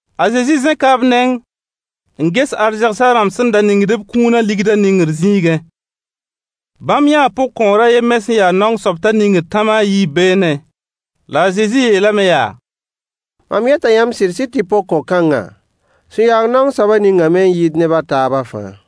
A Zezi zẽka b neng n ges arzegsã rãmb sẽn da ningd b kũunã ligdã ningr zĩigẽ. Bãmb yãa pʋgkõor a yen me sẽn ya naong soab t'a ningd tãma a yiib beene. La a Zezi yeelame yaa: Mam yeta yãmb sɩd-sɩd tɩ pʋgkõ-kãngã sẽn ya naong soabã ningame n yɩɩd neb a taabã fãa.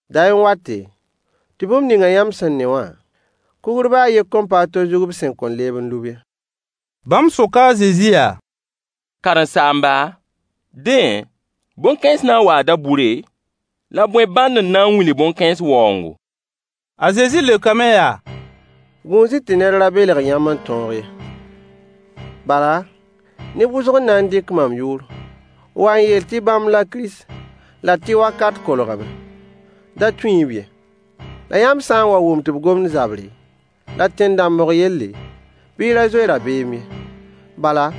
Day n wate, tɩ bũmb ningã yãmb sẽn ne wã, kugr baa a yen kõn pa a to zug b sẽn kõn leeb n lub ye. Bãmb soka a Zezi yaa: Karen-saamba, dẽ, bõn-kãens na n waa dabʋre, la bõe bãnd n na n wilg bõn-kãens waoongo? A Zezi leokame yaa: Gũus-y tɩ ned ra belg yãmb n tõog ye. Bala, neb wʋsg n na n dɩk mam yʋʋr n wa n yeel tɩ bãmb la Kirist, la tɩ wakat kolgame. Da tũ-y-b ye. La yãmb sã n wa wʋm tɩ b gomd zabre, la tẽn-dãmbg yelle, bɩ y ra zoe rabeem ye. Bala,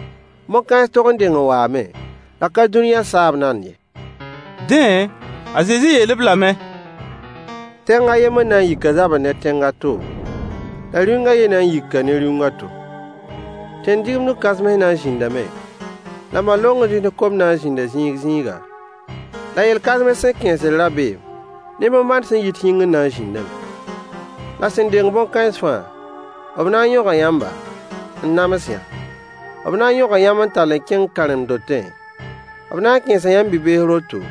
bõn-kãens tog n deng n waame, la ka dũniyã saab nand ye. Dẽ, a Zezi yeel-b lame: Tẽng a yembr na yika zabr ne tẽng a to, la rĩung a yen na n yika ne rĩung a to. Tẽn-digimdg kãsems na n zĩndame, la bã-longds ne kom na n zĩnda zĩig zĩiga, la yel-kãsems sẽn kẽesd rabeem ne bõn-bãn sẽn yit yĩngr na n zĩndame. La sẽn deng bõn-kãens fãa, b na n yõga yãmba, n nams-yã. B na n yõga yãmb n tall n kẽng karen-dotẽ, b na n kẽesa yãmb bi-bees roto,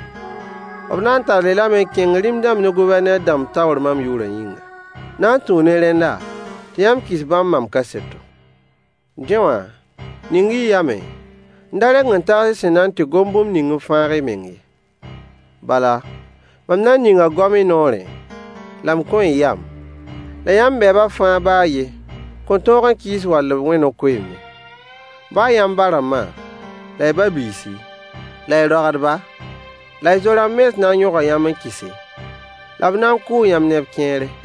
b na n tall-y lame n kẽng rĩm-dãmb ne Gʋvɛrneer dãmb taoor mam yʋʋrã yĩnga. Na n tũu ne rẽnda tɩ yãmb kɩs bãmb mam kaseto. Dẽ wã, ning-y y yamẽ, n da reng n tags y sẽn na n tɩ gom bũmb ning n fãag y meng ye. Bala, mam na n ninga goam y noorẽ, la m kõ-y yam, la yãmb bɛɛbã fãa baa a yen kõn tõog n kɩɩs wall b wẽ no-koeemd ye. Baa yãmb ba-rãmba, la y ba-biisi, la y roagdba, la y zo-rãmb mens na n yõga yãmb n kɩse, la b na n kʋʋ yãmb neb kẽere.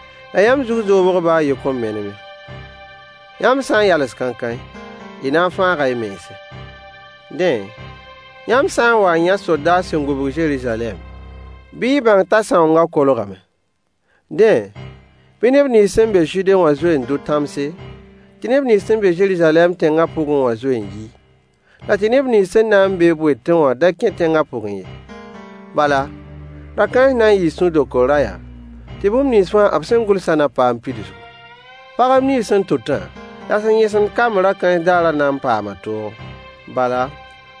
La yãmb zug zoobg baa a yen kõn menem ye. Yãmb sã n yals kãenkãe, y na n fãaga y mense. Dẽ, yãmb sã n wa n yã sodaas sẽn gũbg Zeruzalɛm, bɩ y bãng t'a sãoongã kolgame. Dẽ, bɩ neb nins sẽn na n be Zude wã zoe n dʋ tãmse, tɩ neb nins sẽn be Zeruzalɛm tẽngã pʋgẽ wã zoe n yi, la tɩ neb nins sẽn na n be-b wetẽ da kẽ tẽngã pʋgẽ ye. Bala, ra-kãens na n yɩɩ sũ-dokr rayã, tɩ bũmb nins fãa b sẽn gʋlsã na paam pidsgu. Pagb nins sẽn tʋtã, la sẽn yẽsemd kamb ra-kãens daarã na n paama toogo. Bala,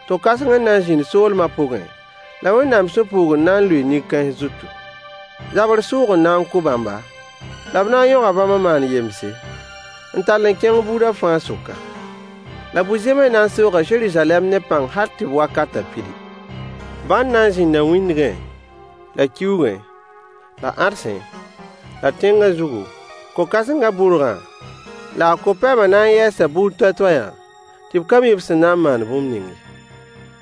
to-kãseng n na n zĩnd soolmã pʋgẽ, la Wẽnnaam sũ-puugr na n lʋɩɩ nin-kãens zutu. Zabr sʋʋg n na n kʋ bãmba, la b na n yõga bãmb n maan yemse, n tall n kẽng buudã fãa sʋka. La bu-zẽms na n sooga Zeruzalɛm ne pãng hal tɩ b wakatã pidi. Bãn na n zĩnda wĩndgẽ, la kiuugẽ, la ãdsẽ, la tẽngã zugu, ko-kãsengã bʋrgã, la a ko-pɛmã na n yɛɛsa buud toay-toayã tɩ b ka mi b sẽn na n maan bũmb ning ye.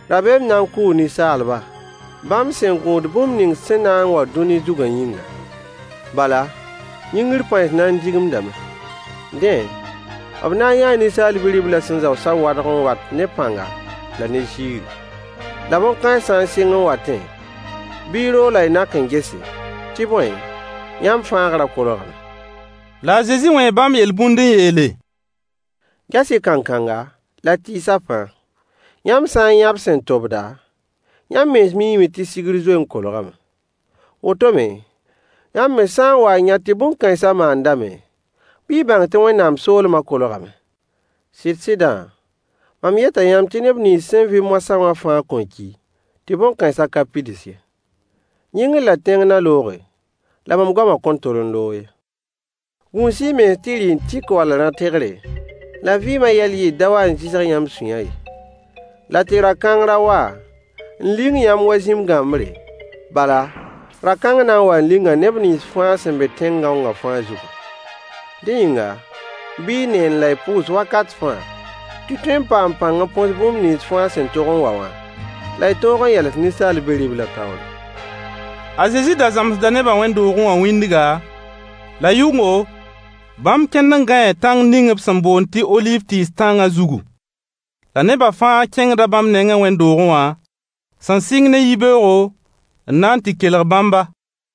Rabeem na n kʋʋ ninsaalba, bãmb sẽn gũud bũmb ning sẽn na n wa dũni zugã yĩngã. Bala, yĩngr pãens na n digimdame. Dẽ, b na n yãa Ninsaal Bi-riblã sẽn zao sawadg n wat ne pãnga la ne ziiri. La bõn-kãens sã n sɩng n watẽ, bɩ y roog la y nak n gese, tɩ bõe, yãmb fãagrã kolgame. La a Zezi wẽe bãmb yel-bũnd n yeele: Ges-y kankanga, la tɩɩsã fãa. Yãmb sã n yã b sẽn tobda, yãmb mens miime tɩ sigr zoe n kolgame. Woto me, yãmb me sã n wa n yã tɩ bũmb kãensã maandame, bɩ y bãng tɩ Wẽnnaam soolmã kolgame. Sɩd-sɩdã, mam yeta yãmb tɩ neb nins sẽn vɩ moasã wã fãa kõn ki tɩ bõn-kãensã ka pids ye. Yĩngr la tẽng na looge, la mam goamã kõn tol n loog ye. Gũus-y y mens tɩ rɩ-n-tɩk wall rã-tɩgre, la vɩɩmã yɛl yɩɩr da wa n zɩsg yãmb sũyã ye, la tɩ ra-kãng ra wa n ling yãmb wa zĩm-gãmbre, bala, ra-kãng na n waa n linga neb nins fãa sẽn be tẽn-gãongã fãa zugã. Dẽ yĩnga, bɩ y neend la y pʋʋs wakat fãa tɩ y tõe n paam pãng n põs bũmb nins fãa sẽn tog n wa wã, la y tõog n yals Ninsaal Bi-riblã taoore. A Zezi da zãmsda nebã wẽnd-doogẽ wã wĩndga, la yʋngo bãmb kẽnd n gãee tãng ning b sẽn boond tɩ oliiv tɩɩs tãnga zugu. La nebã fãa kẽngda bãmb nengẽ wẽnd-doogẽ wã, sẽn sɩng ne yibeoogo, n na n tɩ kelg bãmba.